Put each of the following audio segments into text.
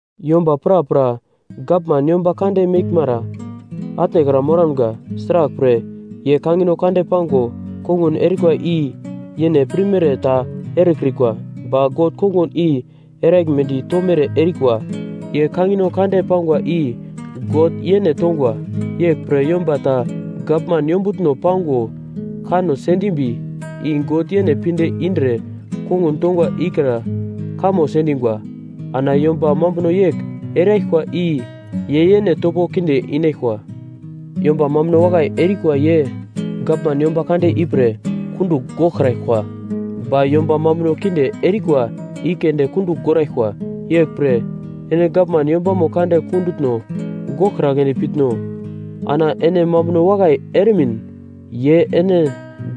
Yomba prapra gavman yomba kande meglmara atnekra moramga. Sraglpre, ye kangino kande pango kongun erikwa i yene pirmere ta erekrikwa, ba God kongun i eraglmedi tomere erikwa. Ye kangino kande pangwa i God yene tongwa. Yeglpre yomba ta gavman yombutno pango kanno sendimbi, i God yene pinde indre kongun tongwa ikra kamo sendingwa. Ana yomba mambuno yegl eraglkwa i ye yene topo kinde inaglkwa. Yomba mambuno wakai erikwa ye gavman yomba kande ipre kundugl goglkraglkwa, ba yomba mambuno kinde erikwa i keunde kundugl goraglkwa. Yeglpre ene gavman yombamo kande kundutno goglkragledi pitno? Ana ene mambuno wakai eremin ye ene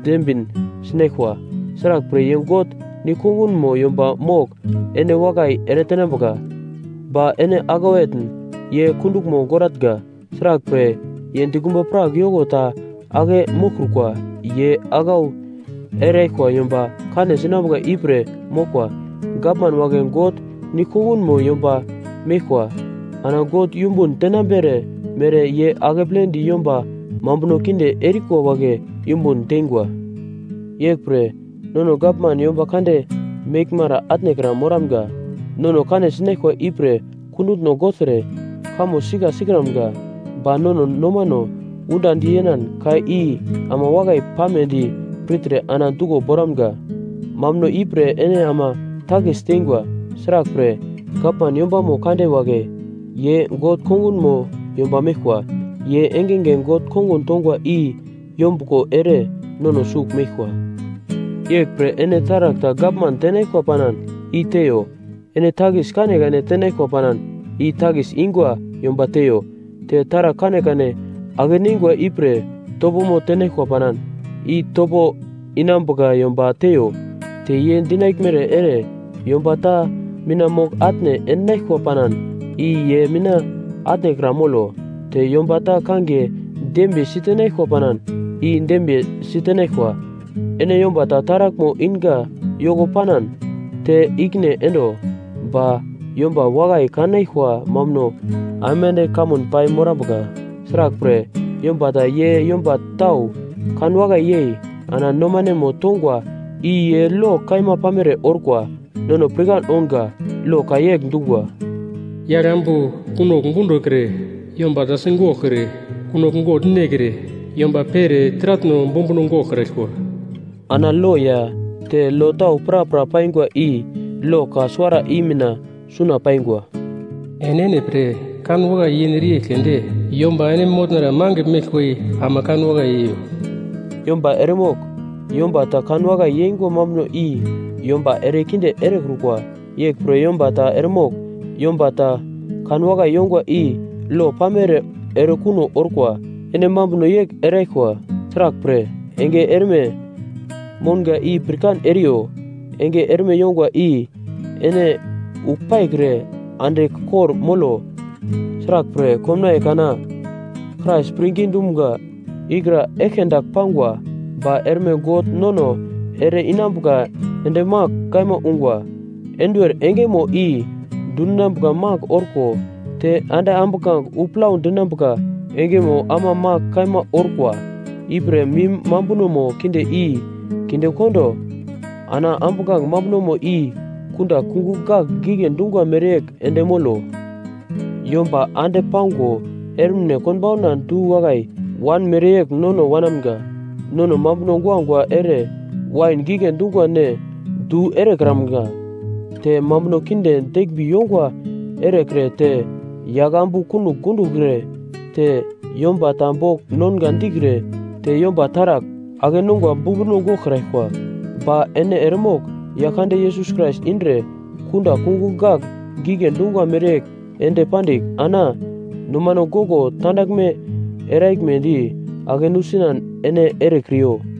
dembin sinaglkwa. Sraglpre, ye God nigl-kongunmo yomba mogl ene wakai eretenambuka. Ba ene aglau etn, ye kunduglmo goratnga; sraglpre, ye dikumba prak yoko ta ake moglkrukwa. Ye aglau eraglkwa yomba kane sinambuka ipre moglkwa. Gavman wagle God nigl-kongunmo yomba meglkwa, ana God yumbun tenambere mere ye akepledi yomba mambuno kinde erikwa wagle yumbun teingwa. Yeglpre, nono gavman yomba kande meglmara atnekra moramga. Nono kane sinaglkwa ipre kundutno gogltre, kamo sika sikramga, ba nono nomano undandi yenan ka i ama wakai pamedi pirtre ana duglo boramga. Mambuno ipre ene ama takis teingwa: Sraglpre, gavman yombamo kande wagle ye God kongunmo yomba meglkwa. Ye engenge God kongun tongwa i yombuglo ere nono sugl meglkwa. Yeglpre ene taragl ta gavman tenaglkwa panan, i teiyo: Ene takis kanekane tenaglkwa panan, i takis ingwa yomba teiyo; te taragl kanekane ake-neingwa ipre topomo tenaglkwa panan, i topo inambuka yomba teiyo; te ye dinaglmere ere yomba ta mina mogl-atne endinaglkwa panan, i ye mina atnekra molo; te yomba ta kangiye dembiye sitenaglkwa panan, i dembiye sitenaglkwa. Ene yomba ta taraglmo inga yoko panan, te ikine endo. Ba yomba wakai kanaglkwa mambuno aimande kamun pai morambuka. Sraglpre, yomba ta ye yomba tau kanwakai yei ana nomanemo tongwa i ye lo kaima pamere orkwa. Nono pirkan ounga lo ka yegl dungwa, “Yagl ambu kunogl gundokre,” “Yomba ta sigoglkre,” “Kunogl gogl nekre,” “Yomba pere taratno bumbuno goglkraglkwa.” Ana lo ya te lo tau prapra paingwa i lo ka suwara i mina suna paingwa: “Enene pre kanwakai yenere yegl keunde yomba ene motnara magl meglkwa ama kanwakai yeiyo.” Yomba eremogl yomba ta kanwakai yeingwa mambuno i yomba erekinde erekrukwa. Yeglpre yomba ta eremogl yomba ta kanwakai yongwa i lo pamere erekuno orkwa. Ene mambuno yegl eraglkwa, sraglpre, enge erme mounga i pirkan eriyo: Enge erme yongwa i, ene uglpaikre andigl kor-molo. Sraglpre, komnaiye kana Krais pirngi dumga ikra eglke dagl pangwa ba erme God nono ere-inambuka ende magl kaima ungwa. Enduwer engemo i dundinambuka magl orko te ande ambuglange wu plau dinambuka engemo ama magl kaima orkwa. Ipre mim mambunomo kinde i kindekondo ana ambuglange mambunomo i kunda kungugl gagl gigle dungwa mereyegl ende molo. Yomba ande pango ermine konbauna du-wakai wan mereyegl nono wanamga. Nono mambuno guagua ere wain gigle dungwa ne du erekramga; te mambuno kinde deglmbi yongwa erekre te yaglambu kunogl gundokre; te yomba ta bogl nonga dikre te yomba taragl ake-nongwa bumbuno goglkraglkwa. Ba ene eremogl Yaglkande Yesus Krais indre kunda kungugl gagl gigle dungwa mereyegl ende pandigl, ana nomano goglo tandaglme eraglmedi ake nusinan ene erekriyo.